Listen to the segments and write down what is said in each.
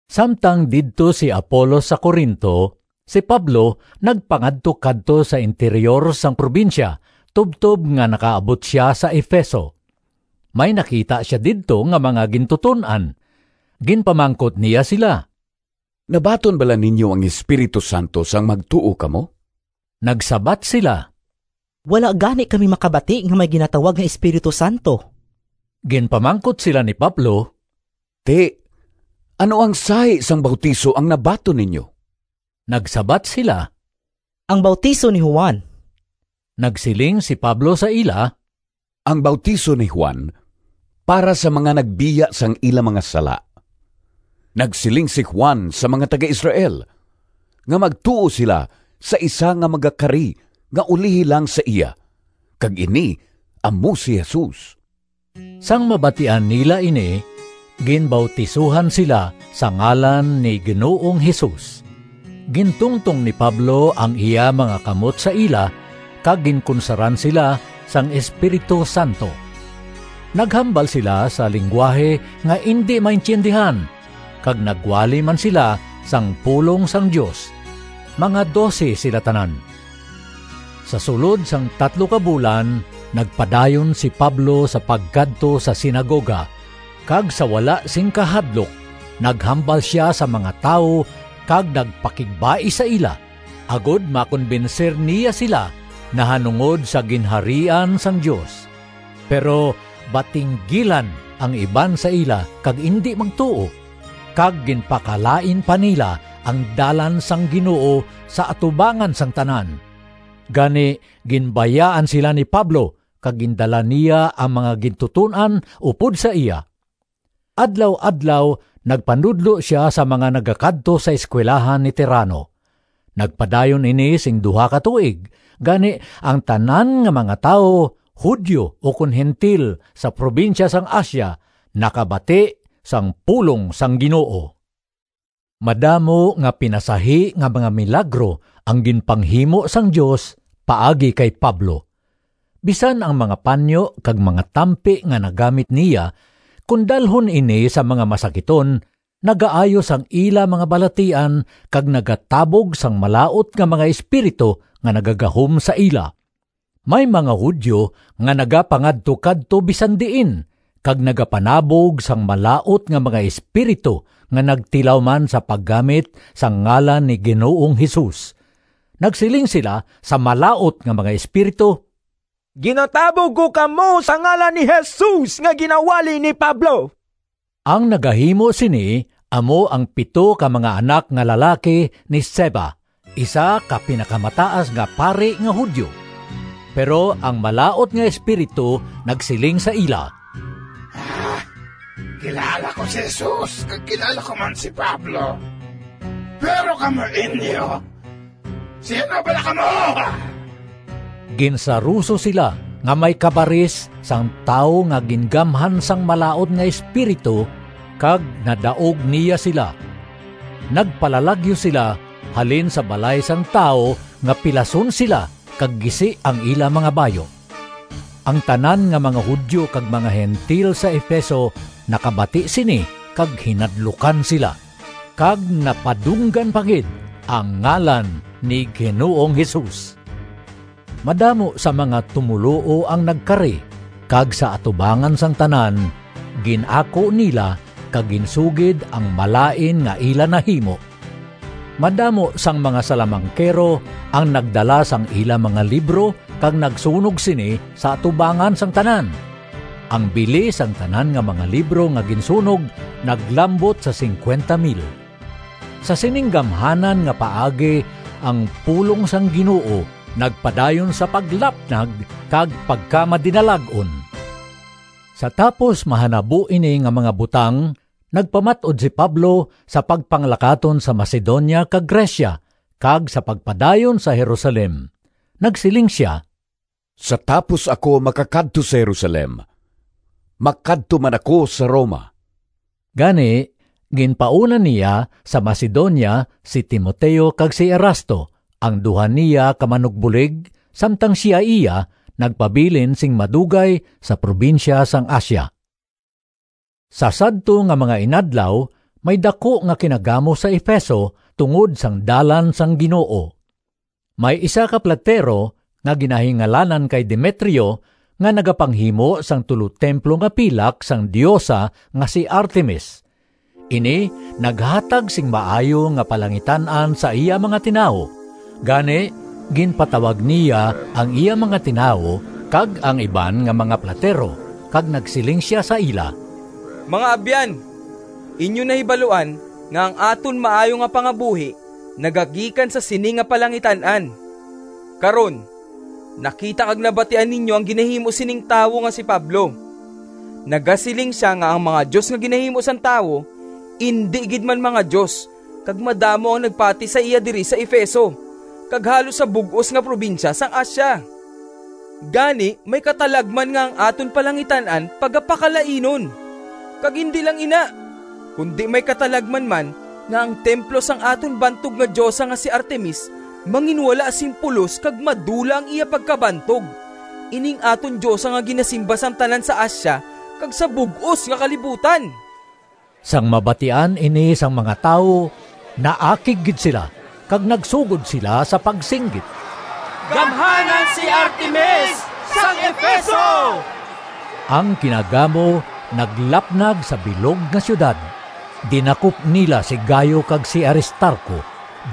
Samtang didto si Apolos sa Corinto, si Pablo nagpangadtukadto sa interyor sang probinsya tubtob nga nakaabot sia sa Efeso. May nakita sia didto nga mga gintuton-an. Ginpamangkot niya sila, “Nabaton bala ninyo ang Espiritu Santo sang magtuo kamo?” Nagsabat sila, “Wala gani kami makabati nga may ginatawag nga Espiritu Santo.” Ginpamangkot sila ni Pablo, “Ti, ano ang sahi sang bautiso ang nabaton ninyo?” Nagsabat sila, “Ang bautiso ni Juan.” Nagsiling si Pablo sa ila, “Ang bautiso ni Juan para sa mga nagbiya sang ila mga sala. Nagsiling si Juan sa mga taga-Israel nga magtuo sila sa isa nga magakari nga ulihi lang sa iya kag ini amo si Jesus.” Sang mabatian nila ini, ginbautisohan sila sa ngalan ni Ginoong Jesus. Gintungtong ni Pablo ang iya mga kamot sa ila kag ginkunsaran sila sang Espiritu Santo. Naghambal sila sa linggwahe nga indi maintiyendihan kag nagwali man sila sang pulong sang Dios. Mga dose sila tanan. Sa sulod sang tatlo ka bulan nagpadayon si Pablo sa pagkadto sa sinagoga, kag sa wala sing kahadlok naghambal sia sa mga tawo kag nagpakigbais sa ila, agod makonbensir niya sila nahanungod sa Ginharian sang Dios. Pero batinggilan ang iban sa ila kag indi magtuo, kag ginpakalain pa nila ang Dalan sang Ginoo sa atubangan sang tanan. Gani ginbayaan sila ni Pablo kag gindala niya ang mga gintuton-an upod sa iya. Adlaw-adlaw nagpanudlo sia sa mga nagakadto sa eskuwelahan ni Tirano. Nagpadayon ini sing duha ka tuig, gani ang tanan nga mga tawo, Judio ukon Gentil, sa probinsya sang Asia nakabati sang pulong sang Ginoo. Madamo nga pinasahi nga mga milagro ang ginpanghimo sang Dios paagi kay Pablo. Bisan ang mga panyo kag mga tampi nga nagamit niya, kon dalhon ini sa mga masakiton, nagaayo sang ila mga balatian kag nagatabog sang malaut nga mga espiritu nga nagagahom sa ila. May mga Judio nga nagapangadtukadto bisan diin kag nagapanabog sang malaut nga mga espiritu nga nagtilaw man sa paggamit sang ngalan ni Ginoong Jesus. Nagsiling sila sa malaut nga mga espiritu, “Ginatabog ko kamo sa ngalan ni Jesus nga ginawali ni Pablo.” Ang nagahimo sini amo ang pito ka mga anak nga lalaki ni Sceva, isa ka Pinakamataas nga Pari nga Judio. Pero ang malaut nga espiritu nagsiling sa ila, “Kilala ko si Jesus kag kilala ko man si Pablo, pero kamo inyo, sin-o bala kamo?” Ginsaruso sila nga may kabaris sang tawo nga gingamhan sang malaut nga espiritu kag nadaog niya sila. Nagpalalagyo sila halin sa balay sang tawo nga pilason sila kag gisi ang ila mga bayu. Ang tanan nga mga Judio kag mga Gentil sa Efeso nakabati sini kag hinadlukan sila, kag napadunggan pa gid ang ngalan ni Ginoong Jesus. Madamo sa mga tumoluo ang nagkari, kag sa atubangan sang tanan, gin-ako nila kag ginsugid ang malain nga ila nahimo. Madamo sang mga salamangkero ang nagdala sang ila mga libro kag nagsunog sini sa atubangan sang tanan. Ang bili sang tanan nga mga libro nga ginsunog naglambot sa P50,000. Sa sining gamhanan nga paagi ang pulong sang Ginoo nagpadayon sa paglapnag kag pagkamadinalag-on. Sa tapos mahanabo ini nga mga butang nagpamat-od si Pablo sa pagpanglakaton sa Macedonia kag Grecia, kag sa pagpadayon sa Jerusalem. Nagsiling sia, “Sa tapos ako makakadto sa Jerusalem, makadto man ako sa Roma.” Gani ginpauna niya sa Macedonia si Timoteo kag si Erasto, ang duha niya ka manugbulig, samtang sia iya nagpabilin sing madugay sa probinsya sang Asia. Sa sadto nga mga inadlaw may daku nga kinagamo sa Efeso tungod sang Dalan sang Ginoo. May isa ka platero nga ginahingalanan kay Demetrio nga nagapanghimo sang tulotemplo nga pilak sang diosa nga si Artemis. Ini naghatag sing maayo nga palangitan-an sa iya mga tinawo. Gani ginpatawag niya ang iya mga tinawo kag ang iban nga mga platero kag nagsiling sia sa ila, “Mga abyan, inyo nahibaluan nga ang aton maayo nga pangabuhi nagagikan sa sini nga palangitan-an. Karon nakita kag nabatian ninyo ang ginahimo sining tawo nga si Pablo. Nagasiling sia nga ang mga dios nga ginahimo sang tawo indi gid man mga dios kag madamo ang nagpati sa iya diri sa Efeso kag halos sa bug-os nga probinsya sang Asia. Gani may katalagman nga ang aton palangitan-an pagapakalainon. Kag indi lang ina, kundi may katalagman man nga ang templo sang aton bantog nga diosa nga si Artemis manginwala sing pulos kag madula ang iya pagkabantog—ining aton diosa nga ginasimba sang tanan sa Asia kag sa bug-os nga kalibutan!” Sang mabatian ini sang mga tawo naakig gid sila kag nagsugod sila sa pagsinggit, “Gamhanan si Artemis sang Efeso!” Ang kinagamo naglapnag sa bilog nga siyudad. Dinakop nila si Gayo kag si Aristarco,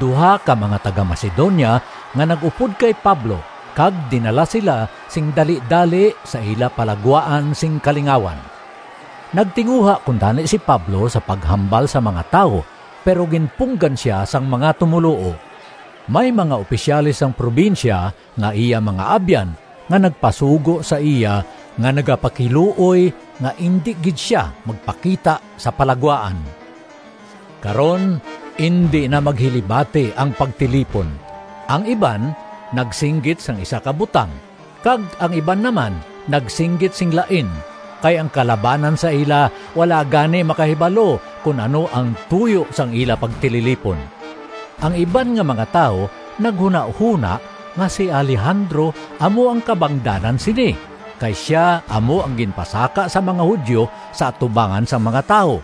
duha ka mga taga-Macedonia nga nag-upod kay Pablo kag dinala sila sing dalidali sa ila palagwaan sing kalingawan. Nagtinguha kuntani si Pablo sa paghambal sa mga tawo, pero ginpunggan sia sang mga tumoluo. May mga opisyales sang probinsya nga iya mga abyan nga nagpasugo sa iya nga nagapakiluoy nga indi gid sia magpakita sa palagwaan. Karon, indi na maghilibati ang pagtilipon. Ang iban nagsinggit sang isa ka butang kag ang iban naman nagsinggit sing lain kay ang kalabanan sa ila wala gani makahibalo kon ano ang tuyo sang ila pagtililipon. Ang iban nga mga tawo naghunahona nga si Alejandro amo ang kabangdanan sini kay sia amo ang ginpasaka sang mga Judio sa atubangan sang mga tawo.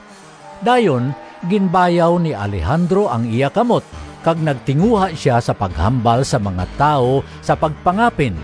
Dayon ginbayaw ni Alejandro ang iya kamot kag nagtinguha sia sa paghambal sa mga tawo sa pagpangapin,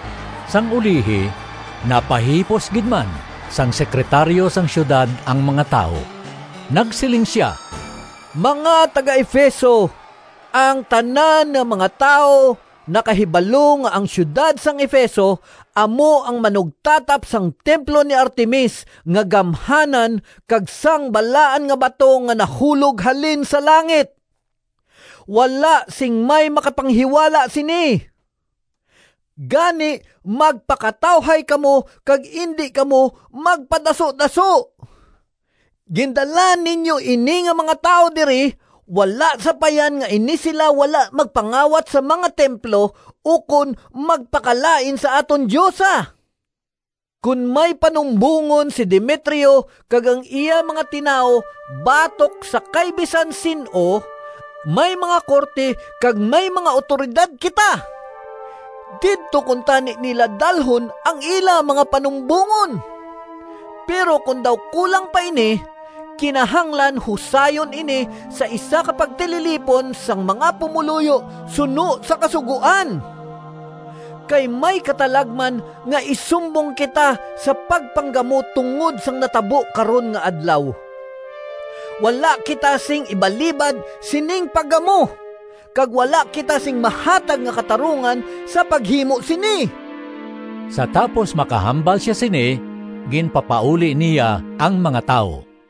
Sang ulihi napahipos gid man sang sekretaryo sang siyudad ang mga tawo. Nagsiling sia, “Mga taga-Efeso, ang tanan nga mga tawo nakahibalo nga ang siyudad sang Efeso amo ang manugtatap sang templo ni Artemis nga gamhanan kag sang balaan nga bato nga nahulog halin sa langit. Wala sing may makapanghiwala sini. Gani magpakatawhay kamo kag indi kamo magpadasudaso. Gindala ninyo ini nga mga tawo diri, wala sapayan nga ini sila wala magpangawat sa mga templo ukon magpakalain sa aton diosa. Kon may panumbongon si Demetrio kag ang iya mga tinawo batok sa kay bisan sin-o, may mga korte kag may mga awtoridad kita. Didto kuntani nila dalhon ang ila mga panumbongon. Pero kon daw kulang pa ini kinahanglan husayon ini sa isa ka pagtililipon sang mga pumoluyo suno sa kasugoan. Kay may katalagman nga isumbong kita sa pagpanggamo tungod sang natabo karon nga adlaw. Wala kita sing ibalibad sining paggamo kag wala kita sing mahatag nga katarungan sa paghimo sini.” Sa tapos makahambal sia sini ginpapauli niya ang mga tawo.